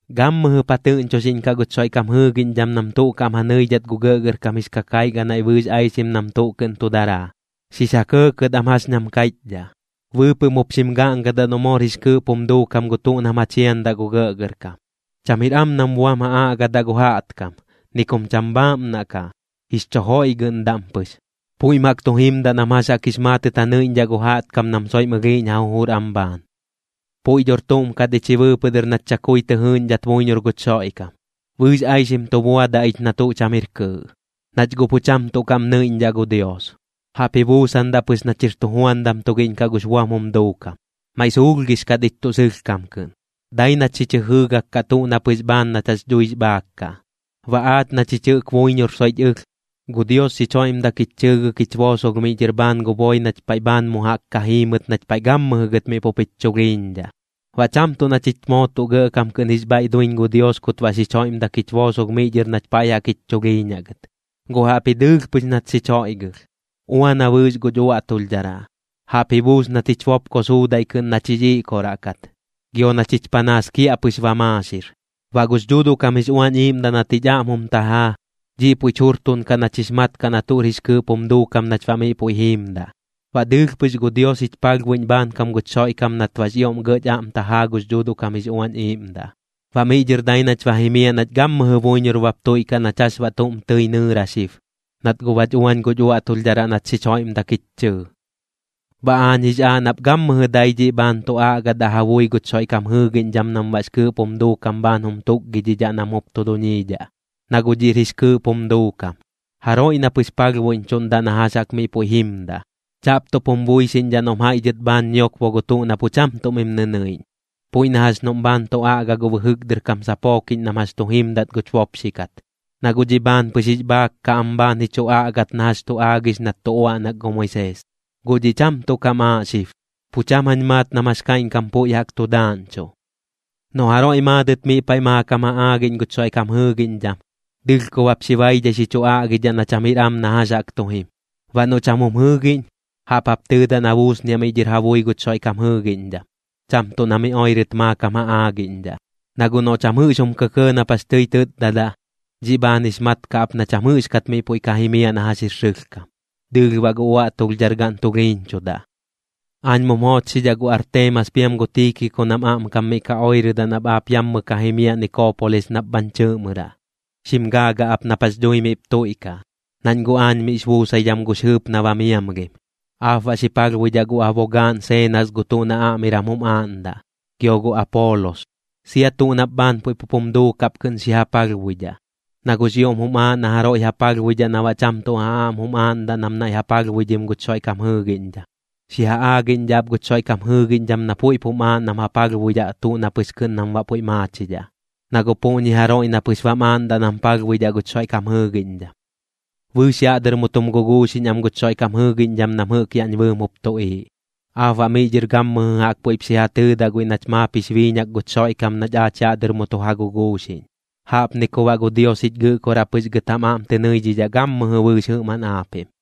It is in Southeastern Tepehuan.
Gammɨjɨp ja tɨꞌñchoxiꞌñkaꞌ guch Xoiꞌkam jɨɨgiꞌñdham nam tuꞌ kaꞌm ja nɨidhat gu gɇꞌgɇrkam jix kakaiꞌ ganaiꞌ bɨɨx aixim nam tuꞌ kɨꞌn tu daraa, xix ja kɇɇkɇt am jax ñam kaiꞌchdhaꞌ. Bɨɨpɨꞌm jup xim gaꞌngadaꞌ noꞌ moor jix kɨɨꞌp jum duukam gu tuꞌ nam ja chiandaꞌ gu gɇꞌgɇrkam. Cham jir am nam buam ja aꞌgadaꞌ gu jaꞌtkam, ni kum cham bhaaꞌmnaꞌ kaꞌ, jix chu joiꞌgɨꞌndaꞌm pɨx. Puiꞌm jaꞌk tu jimdaꞌ nam jax jaꞌk jix maatɨt ja nɨiꞌñdhaꞌ gu jaꞌtkam nam soiꞌm ɨlhiiꞌñ ja jujur am bhaan. Puiꞌ dhor tuꞌm kat ich ji bɨɨpɨꞌ dɨr nach chakui tɨ jɨɨꞌñdhat buiñor guch Xoiꞌkam, bɨɨx aixim tu buadaꞌ ich na tuꞌ cham jir kɨɨꞌ, nach guꞌ pu cham tuꞌ kaꞌm nɨiꞌñdhaꞌ gu Dios, jaꞌp ji buusandaꞌ pɨx nach jir tujuandam tugiꞌñ kaꞌ gux buam jum duukam. Maiꞌ suulhgix kat ich tuꞌ sɨlhkam kɨꞌn, dai nach xich jɨjɨɨgak kaꞌ tuꞌ na pɨx bhaan nach jax dhuix bhaak kaꞌ. Baꞌ aach na chich jɨꞌk buiñor soiꞌch ɨlh, gu Dios xich joiꞌmdak jich chɨɨgɨk jich boosolh miꞌ dhɨr bhaan gu boi nach paiꞌ bhaan mu jaꞌk ka jiimɨt nach paiꞌ gammɨjɨ gɨt miꞌ pup jich chulhiiñdhaꞌ. Baꞌ cham tuꞌ na chich moo tuꞌ gɇꞌkam kɨꞌn jix bhaiꞌ duiñ gu Dios kut baꞌ xich joiꞌmdak jich boosolh miꞌ dhɨr nach paiꞌ jaꞌk jich chulhiiñaꞌ gɨt, gu jaꞌpji dɨɨlh pɨx nat xich joiꞌgɨlh. Uana bɨɨx guch uaꞌtulhdharaꞌ, jaꞌp ji buus nat jich bopko suudaiꞌ kɨꞌn nach jix iꞌkoraꞌ kat, gio na chich panaas kiaꞌpɨx ba maaxir. Baꞌ gux Dhuuduꞌ kam jix Uañ Iiꞌmdaꞌ nat jich aꞌm jum tajaa, dhiꞌ puiꞌch jurtuꞌnkaꞌ nach jix mat kaꞌ na tuꞌr jix kɨɨꞌp jum duukam nach baꞌ miꞌ puiꞌ jiimdaꞌ. Baꞌ dɨɨlh pɨx gu Dios jich palhbuiꞌñ bhaankam guch Xoiꞌkam nat baꞌx ioꞌm gɇꞌch aꞌm tajaa gux Dhuuduꞌ kam jix Uañ Iiꞌmdaꞌ. Baꞌ miꞌ dhɨr dai nach ba jimiaꞌ nach gammɨjɨ buiñor bap tuiꞌkaꞌ nach jax baꞌ tuꞌm tɨi nɨɨra xib, nat guꞌ bach uañ guch uaꞌtulhdharaꞌ nat xich joiꞌmdak jich chɨɨ. Baꞌ aañ jix aaꞌ nap gammɨjɨ dai dhiꞌ bhaan tu aꞌgadaꞌ ja bui guch Xoiꞌkam jɨɨgiꞌñdham nam baꞌx kɨɨꞌp jum duukam bhaan jum tukgidhidhaꞌ nam jup tu duñiidhaꞌ. Na guꞌ dhiꞌr jix kɨɨꞌp jum duukam, jaroiꞌ na pɨx palhbuiꞌñchuꞌndaꞌ na jax jaꞌk miꞌ puiꞌ jimdaꞌ. Chaꞌp tuꞌp jum buixiꞌñdhaꞌ noꞌm jaiꞌ dhɨt bhaan ñiokbo gu tuꞌ na pu cham tuꞌ mim nɨnɨiꞌñ, puiꞌ na jax noꞌm bhaan tu aꞌga gu bɨjɨk dɨr kam sapookiꞌñ nam jax tu jimdat guch bopxi kat, na guꞌ dhiꞌ bhaan pɨx jix bhaak kaꞌ am bhaan ji chu aꞌgat na jax tu aagix nat tu uaꞌnak gu Moisees. Guꞌ dhiꞌ cham tuꞌ kam aaꞌ xib, pu cham jañ maat nam jax kaiꞌñkam puiꞌ jaꞌk tu daaꞌñchuꞌ. Noꞌ jaroiꞌ maadɨt miꞌ paiꞌ maakam ja aagiꞌñ guch Xoiꞌkam jɨɨgiꞌñdham, dɨlhkob jap xi baidhai xi chu aꞌgidhaꞌ na cham jir am na jax jaꞌk tu jim. Baꞌ noꞌ cham jum jɨɨgiꞌñ, jaꞌp jap tɨɨdaꞌ na buusniaꞌ miꞌ dhɨr ja bui guch Xoiꞌkam jɨɨgiꞌñdham, cham tuꞌ na miꞌ oirɨt maakam ja aagiꞌñdhaꞌ. Na guꞌ noꞌ cham jɨꞌx jum kɇkɇɇ nap jax tɨi tɨtdadaꞌ, dhiꞌ bhaan jix mat kaꞌ ap na cham jɨꞌxkat miꞌ puiꞌ ka jimiaꞌ na jax jir sɨlhkam, dɨɨlh baꞌ gu uaꞌtulhdhargaꞌn tulhiiñchudaꞌ. Aañ mum joochxidhaꞌ gu Arteemas piam gu Tiikiko nam aꞌmkam miꞌ ka oirɨdaꞌ nap aap yammɨ ka jimiaꞌ Nikoopolis nap bhañ chɨɨꞌmɨraꞌ. Xim gaagaꞌ ap nap jax dhui miꞌp tuiꞌkaꞌ, nañ guꞌ aañ miꞌx buusaidham gux jɨɨp na ba miamlhim. Aap baꞌ xi palhbuidhaꞌ gu abogaaꞌn Seenas gu tuꞌ na aꞌmiram jum aaꞌndaꞌ, gio gu Apoolos. Sia tuꞌ nap bhaan puiꞌ pup jum duukaꞌp kɨꞌn xi ja palhbuidhaꞌ, na guꞌx ioꞌm jum aaꞌ na jaroiꞌ ja palhbuidhaꞌ na baꞌ cham tuꞌ ja aꞌm jum aaꞌndaꞌ nam naiꞌ ja palhbuidhim guch Xoiꞌkam jɨɨgiꞌñdham. Xi ja aagiꞌñdhaꞌ ap guch Xoiꞌkam jɨɨgiꞌñdham na puiꞌp jum aaꞌ nam ja palhbuidhaꞌ tuꞌ na pɨx kɨꞌn nam baꞌ puiꞌ maachidhaꞌ. Na guꞌ puꞌñi jaroiꞌ na pɨx bam aaꞌndaꞌ nam palhbuidhaꞌ guch Xoiꞌkam jɨɨgiꞌñdham. Bɨɨx yaꞌ dɨr mu tum guguuxiꞌñ am guch Xoiꞌkam jɨɨgiꞌñdham nam jɨꞌk yaꞌñ bɨɨm jup tuꞌiiꞌ. Aap baꞌ miꞌ dhɨr gammɨjɨ jaꞌk puiꞌp xi ja tɨɨdaꞌ guiꞌ nach maap jix biiñak guch Xoiꞌkam nach aach yaꞌ dɨr mu tu ja guguuxiꞌñ. Jaꞌpni ku baꞌ gu Dios jich Gɨꞌkoraꞌ pɨx gɨt jam aꞌm tɨ nɨidhidhaꞌ gammɨjɨ bɨɨx jɨꞌmaꞌn aapiꞌm.